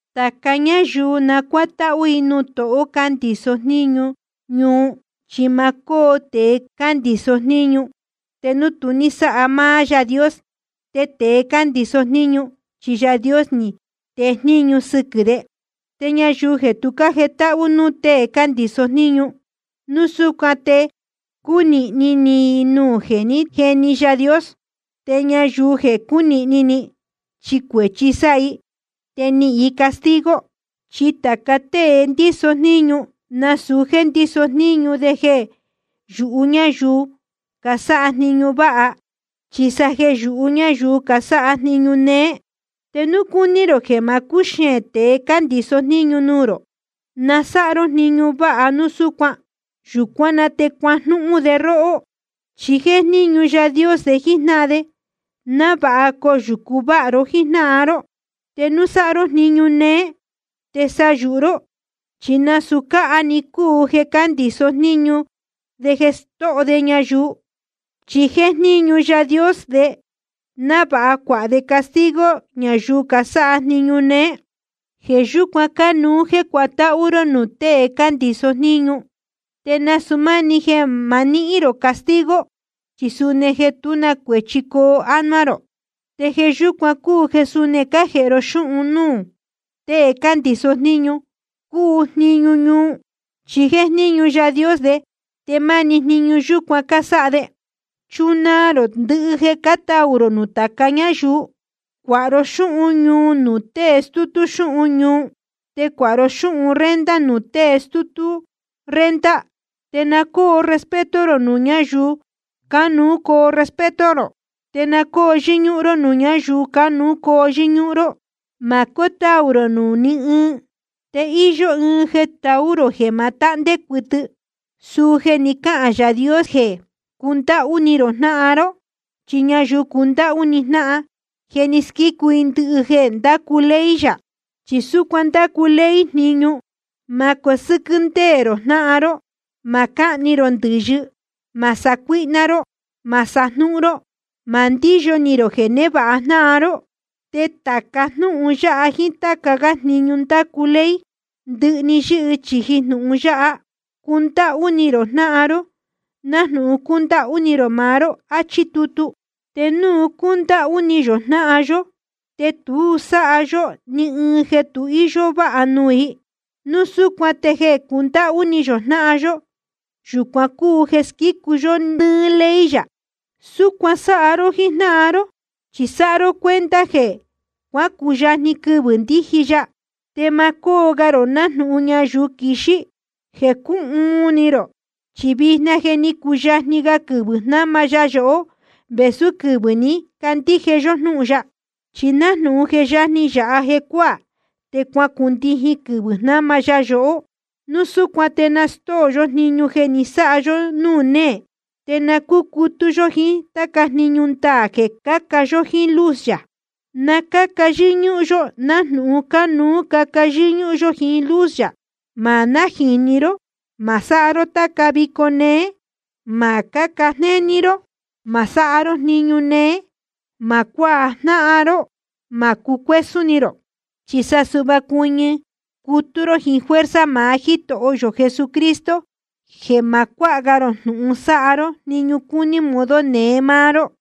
Tāca ñáyuu na cuátáhú i nuū tohō cándiso jníñu ñuu. Chi ma cóo tēe cándiso jníñu te núu tu ní sáha máá Yaā Dios. Te tēe cándiso jníñu chi Yaā Dios ni tee jniñu sɨquɨ̄ de. Te ñayuu jeē tu jétáhú núū tēe cándiso jníñu, núu súcuan te cúnīhni ni i nuū jeē ní jeni Yaā Dios. Te ñayuu jeē cúnīhni ni, chi cuēchi sáha i, te nihīn i castigo. Chi tāca tée ndíso jníñu, nasūu jéē ndíso jníñu de jeē yūhú ñáyuu casáha jniñu váha, chi sa jeē yūhú ñáyuu casáha jniñu néé. Te núu cúní rō jeē ma cúxeēn tēe cándiso jníñu nuū rō, na sáha ró jniñu váha núu súcuan. Yūcuán na te cuajnúhún de róhó. Chi jéjníñu Yaā Dios de jíjnáhan de, návāha coyūcu váha ró jíjnáhan ró. Te núu sáha ró jniñu néé, te sa yūhu ró, chi nasūu cáha‑ni cúu jeē cándiso jníñu de stóho de ñayuu. Chi jéjníñu Yaā Dios de, návāha cuāha de castigo ñayuu casáha jniñu néé. Jeē yúcuan cánuú jéē cuatáhú ró núū tēe cándiso jníñu, te nasūu máni jeē ma níhín rō castigo, chi suni jeē tú na cuēchi coo ánuá rō. Te jeē yúcuan cúu jeē suni cájēhe ró xúhun núū tēe cándiso jníñu cuu jniñu ñuu. Chi jéjníñu Yaā Dios de, te máni jniñu yúcuan cásáha de. Te chunaa rō ndɨhɨ jeē cátaū rō nuū tāca ñáyuu. Cuāha ró xúhun ñuu nuū tée stútú xúhun ñuu, te cuāha ró xúhun renta nuū tée stútú renta. Te na cóo respeto rō nuū ñáyuu cánuú coo respeto rō. Te na cóo yɨ́ñúhún ró nuū ñáyuu cánuú coo yɨ́ñúhún ró. Ma cótaū rō nuū ní ɨɨn. Te íyó ɨɨn jeē taú rō jeē ma tahndé cuɨtɨ, suu jeē ni cáhān Yaā Dios jeē cundáhú ni rō jnáhan ró. Chi ñayuu cundáhú ni jnáhan, je ni squícu i ndɨhɨ jeē ndácu ley yā. Chi súcuan ndácu ley jniñu: Ma cosɨ́quɨ́ ndéē rō jnáhan ró, ma cáhni rō ndɨ̄yɨ, ma sacuíhná ró, ma sajnúhún ró, ma ndíyo ni rō jeē névāha jnáhan ró. Te tāca jnúhun yáha jíín táca gá jniñu ndácu ley, ndɨhɨ‑ni yɨ́hɨ chīji jnūhun yáha: Cundáhú ni rō jnáhan ró nájnūhun cúndáhú ni rō maá ró, áchí tutu. Te núu cúndáhú ni yō jnáhan yó, te tu sáha yó ni ɨɨn jeē tu íyó váha nuū i. Núu súcuan te jeē cundáhú ni yō jnáhan yó, yūcuan cúu jeē squícu yó nɨ́ɨ́ ley yā. Súcuan sáha ró jíjnáhan ró, chi sáha ró cuenta jeē cuácuyajni quɨvɨ̄ ndíji ya. Te ma cóo ga rō nájnūhun ñayuu quixí, jeē cúhuun ni rō. Chi vijna je ni cuyajni ga quɨvɨ̄ jnáma ya yohó vēsú quɨvɨ̄ ní candíje yó jnúhun ya. Chi nájnūhun je yajni yāha jecuáā, te cuacundijin quɨvɨ̄ jnáma ya yohó. Núu súcuan te na stóo yó jniñu jeē ni sáha yó núū néē, te na cúcutú yó jíín táca jniñu ndaā jeē caca yó jiín luz yā. Na cáca yɨ́ñúhún yó nájnūhun cánuú caca yó jíín luz yā. Ma nájīni ró, ma sáha ró táca vico néé, ma cáca jnéní ró, ma sáha ró jniñu néé, ma cuajnáhan ró, ma cucuésún ni rō. Chi sa suhva cuɨñɨ cutú ró jíín fuerza maá Jítoho yō Jesucristo, jeē ma cuáha ga rō jnūhun sáha ró jniñu cúní modo neé máá ró.